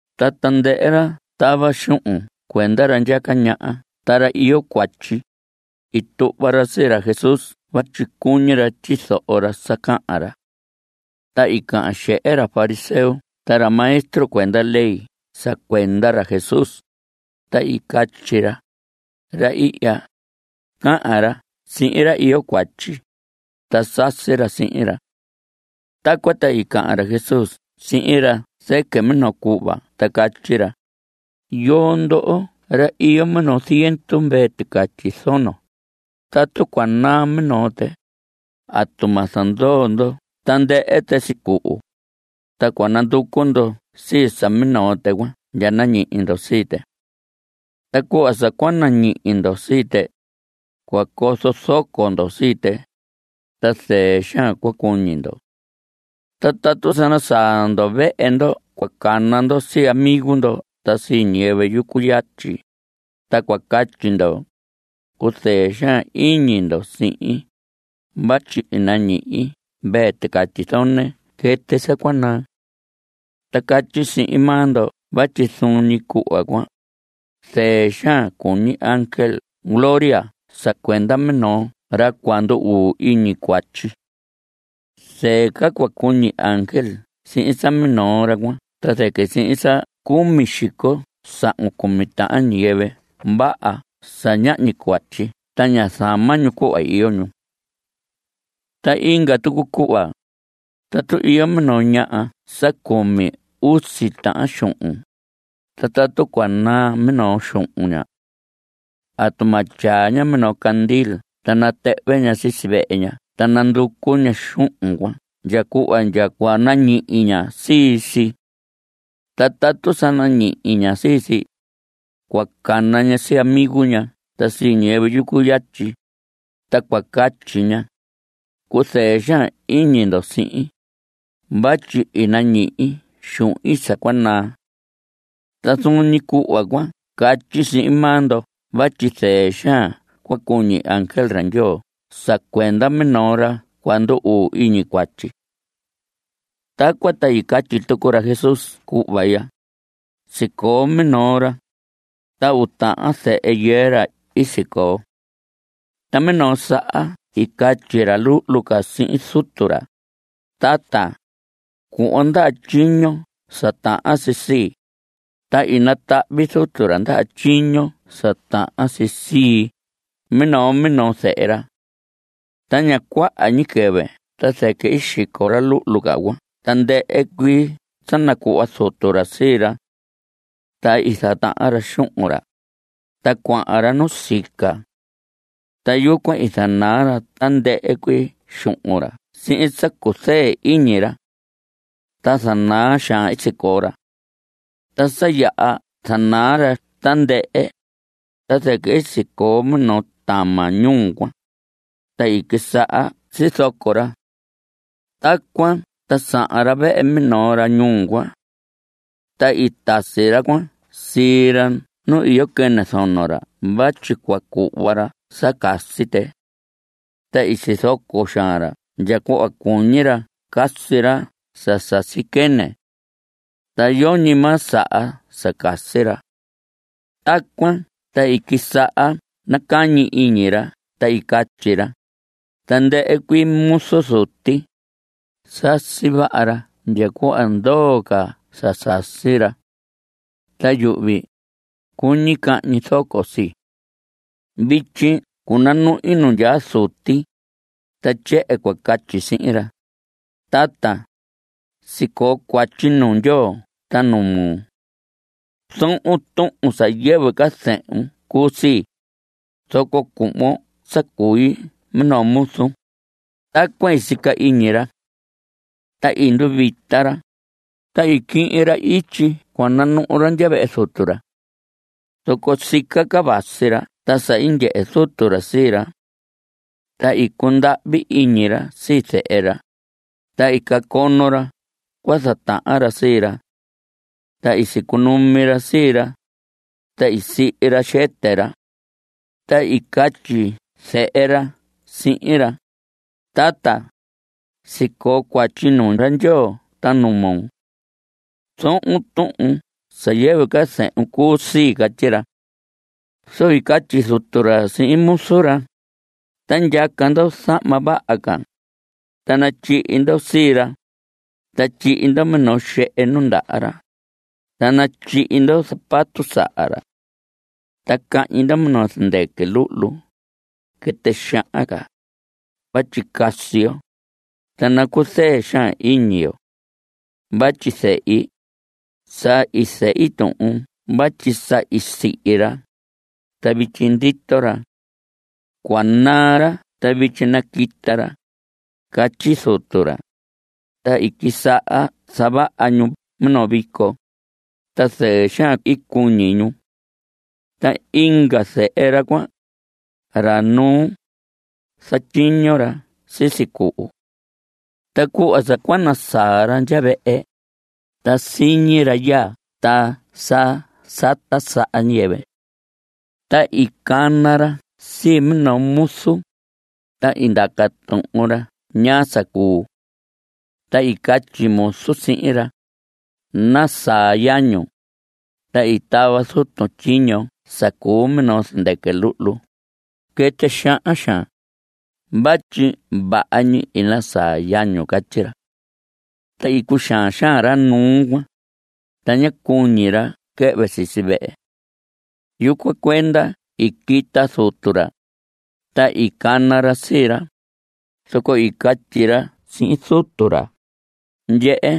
Ta tandɨhɨ ra tava xuhun cuenda ra ndyaca ñaha ta ra iyo cuatyi, i tuhva ra sii ra Jesús vatyi cuñi ra tyizoho ra sa cahan ra. Ta i cahan xehe ra fariseo ta ra maestro cuenda ley sa cuenda ra Jesús, ta i catyi ra: Ra ihya, cahan ra sihin ra iyo cuatyi, ta sasi ra sihin ra. Tacuan ta i cahan ra Jesús sihin ra zɨquɨ minoo cuhva ta catyi ra: Yoo ndoho, ra iyo minoo ziendu mvee ticatyi zono, tatu cua naa minoo tɨ ¿atu ma zandoo ndo tandɨhɨ tɨ sicuhu? Ta cua nanducu ndo sii sa minoo tɨ cuan ndya nañihi ndo sii tɨ. Ta cuhva sa cua nañihi ndo sii tɨ, cua cozo zoco ndo sii tɨ, ta zɨɨ xaan cua cuñi ndo. Ta tatu sa nasaa ndo vehe ndo cua cana ndo sii amigo ndo ta sii ñiyɨvɨ yucu yatyi, ta cua catyi ndo: “Cuzɨɨ xaan iñi ndo sihin, vatyi i nañihi mvee ticatyi zone quɨtɨ sa cua naa.” Ta catyi sihin maa ndo vatyi zuun ñi cuhva cuan, zɨɨ xaan cua cuñi ángel gloria sa cuenda minoo ra cua ndu‑uu iñi cuatyi. Zɨɨ ca cua cuñi ángel sihin sa minoo ra cuan ta zɨquɨ sihin sa cumi xico sahun cumi tahan ñiyɨvɨ vaha sa ñahñi cuatyi ta ña zama ñu cuhva iyo ñu. Ta inga tucu cuhva, tatu iyo minoo ñaha sa cumi usi tahan xuhun, ta tatu cua naa minoo xuhun ña. ¿Atu ma tyaa ña minoo candil ta natɨhvɨ ña sisi vehe ña ta nanducu ña xuhun cuan ndya cuhva ndya cua nañihi ña sii si? Ta tatu sa nañihi ña sii si, cua cana ña sii amigo ña ta sii ñiyɨvɨ yucu yatyi, ta cua catyi ña: “Cuzɨɨ xaan iñi ndo sihin, vatyi i nañihi xuhin sa cua naa.” Ta zuun ñi cuhva cuan catyi sihin maa ndo vatyi zɨɨ xaan cua cuñi ángel ra Ndyoo sa cuenda minoo ra cua ndu‑uu iñi cuatyi. Tacuan ta i catyi tucu ra Jesús cuhva ya: Sicoo minoo ra, ta uu tahan zehe yɨɨ ra i sicoo. Ta minoo saha i catyi ra luhlu ca sihin zutu ra: “Tata, cuhvon ndaha tyiño sa tahan si sii.” Ta i natahvi zutu ra ndaha tyiño sa tahan si sii minoo minoo zehe ra. Ta ña cuaha ñi quɨvɨ ta zɨquɨ i xico ra luhlu ca cuan tandɨhɨ cuii sa nacuhva zutu ra sii ra. Ta i zatahan ra xuhun ra, ta cuahan ra nusica. Ta yucuan i zanaa ra tandɨhɨ cuii xuhun ra sihin sa cuzɨɨ iñi ra. Ta zana xaan i sicoo ra. Ta sa yaha zanaa ra tandɨhɨ, ta zɨquɨ i sicoo minoo tama ñuu cuan, ta i quisaha sizoco ra. Tacuan ta sahan ra vehe minoo ra ñuu cuan. Ta i tasi ra cuan sii ra nu iyo quɨnɨ zono ra vatyi cua cuhva ra sa casi tɨ. Ta i sizoco xaan ra ndya cuhva cuñi ra casi ra sa sasi quɨnɨ. Ta yoñi maa sa saha sa casi ra. Tacuan ta i quisaha nacañi iñi ra ta i catyi ra: “Tandɨhɨ cuii muzu zuti, sasi vaha ra ndya cuhva ndoo ca sa sasi ra. Ta yuhvi, cuñi cahñi zoco sii. Vityi cunanuhi nu ndyaa zuti, ta tyehen cua catyi sihin ra: Tata, sicoo cuatyi nuu Ndyoo ta nuu moo. Zohon tuhun sa yɨvɨ ca zehun cuu sii, zoco cuhvon sa cui minoo muzun.” Tacuan i sica iñi ra. Ta i nduvita ra, ta i quihin ra ityi cua nanuhu ra ndya vehe zutu ra. Zoco sica ca vasi ra ta sa i ndyehe zutu ra sii ra. Ta i cundahvi iñi ra sii zehe ra, ta i cacono ra cua zatahan ra sii ra. Ta i sicunumi ra sii ra, ta i sihi ra xɨtɨ ra. Ta i catyi zehe ra sihin ra: “Tata, sicoo cuatyi nuu ra Ndyoo ta nuu moo. Zohon tuhun sa yɨvɨ ca zehun cuu sii.” Catyi ra. Zoco i catyi zutu ra sihin muzu ra: “Ta ndyaca ndo zahma vaha ca, ta natyihi ndo sii ra. Ta tyihi ndo minoo xehe nundaha ra. Ta natyihi ndo zapato saha ra. Ta cahñi ndo minoo zɨndɨquɨ luhlu, quɨtɨ xahan ca, vatyi casi yo, ta nacuzɨɨ xaan iñi yo. Vatyi zehi, sa i zehi tuhun vatyi sa i sihi ra, ta vityi ndito ra. Cua naa ra ta vityi naquita ra.” Catyi zutu ra. Ta i quisaha zavaha ñu minoo vico. Ta zɨɨ xaan i cuñi ñu. Ta inga zehe ra cuan, ra nuu, zatyiño ra sisi cuhu. Ta cuhva sa cua nasaa ra ndya vehe, ta siñi ra yaa ta sa sata saha ñiyɨvɨ. Ta i cana ra sii minoo muzu, ta i ndaca tuhun ra ñaa sa cuu. Ta i catyi muzu sihin ra: “Nasaa yañun, ta i tava zutun tyiño sa cuu minoo zɨndɨquɨ luhlu, quɨtɨ xahan xaan, vatyi vaha ñi i nasaa yañun.” Catyi ra. Ta i cuxaan xaan ra nuu cuan, ta ñá cuñi ra quɨhvɨ sisi vehe. Yucuan cuenda i quita zutu ra, ta i cana ra sii ra. Zoco i catyi ra sihin zutu ra: “Ndyehe,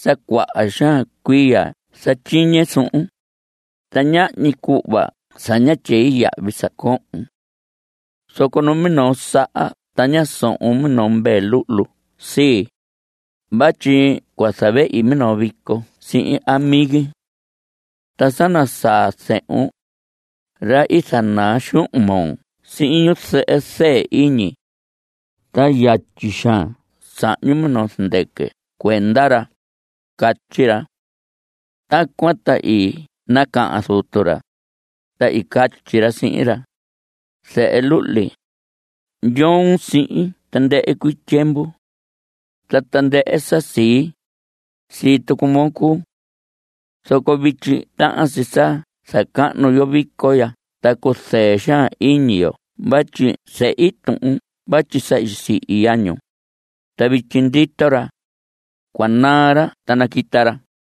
sa cuaha xaan cuiya zatyiñe suhun, ta ñahñi cuhva sa ñá tyei yahvi sa cohon. Zoco numinoo saha ta ñá sohon minoo mvee luhlu sii, vatyi cua zavehi minoo vico sihin amigi. Ta sa nasaa zehun, ra i zanaa xuhun moo sihin ñu zɨhɨ zɨɨ iñi, ta yatyi xaan sahñun minoo zɨndɨquɨ cuenda ra.” Catyi ra. Tacuan ta i nacahan zutu ra, ta i catyi ra sihin ra: “Zehe luhli, ndyoon sihin tandɨhɨ cuii tyiemvu. Ta tandɨhɨ sa sii, sii tucu moo cuu. Zoco vityi tahan si sa zacahnu yo vico ya ta cuzɨɨ xaan iñi yo vatyi i zehi tuhun vatyi sa i sihi yañun, ta vityi ndito ra. Cua naa ra ta naquita ra.”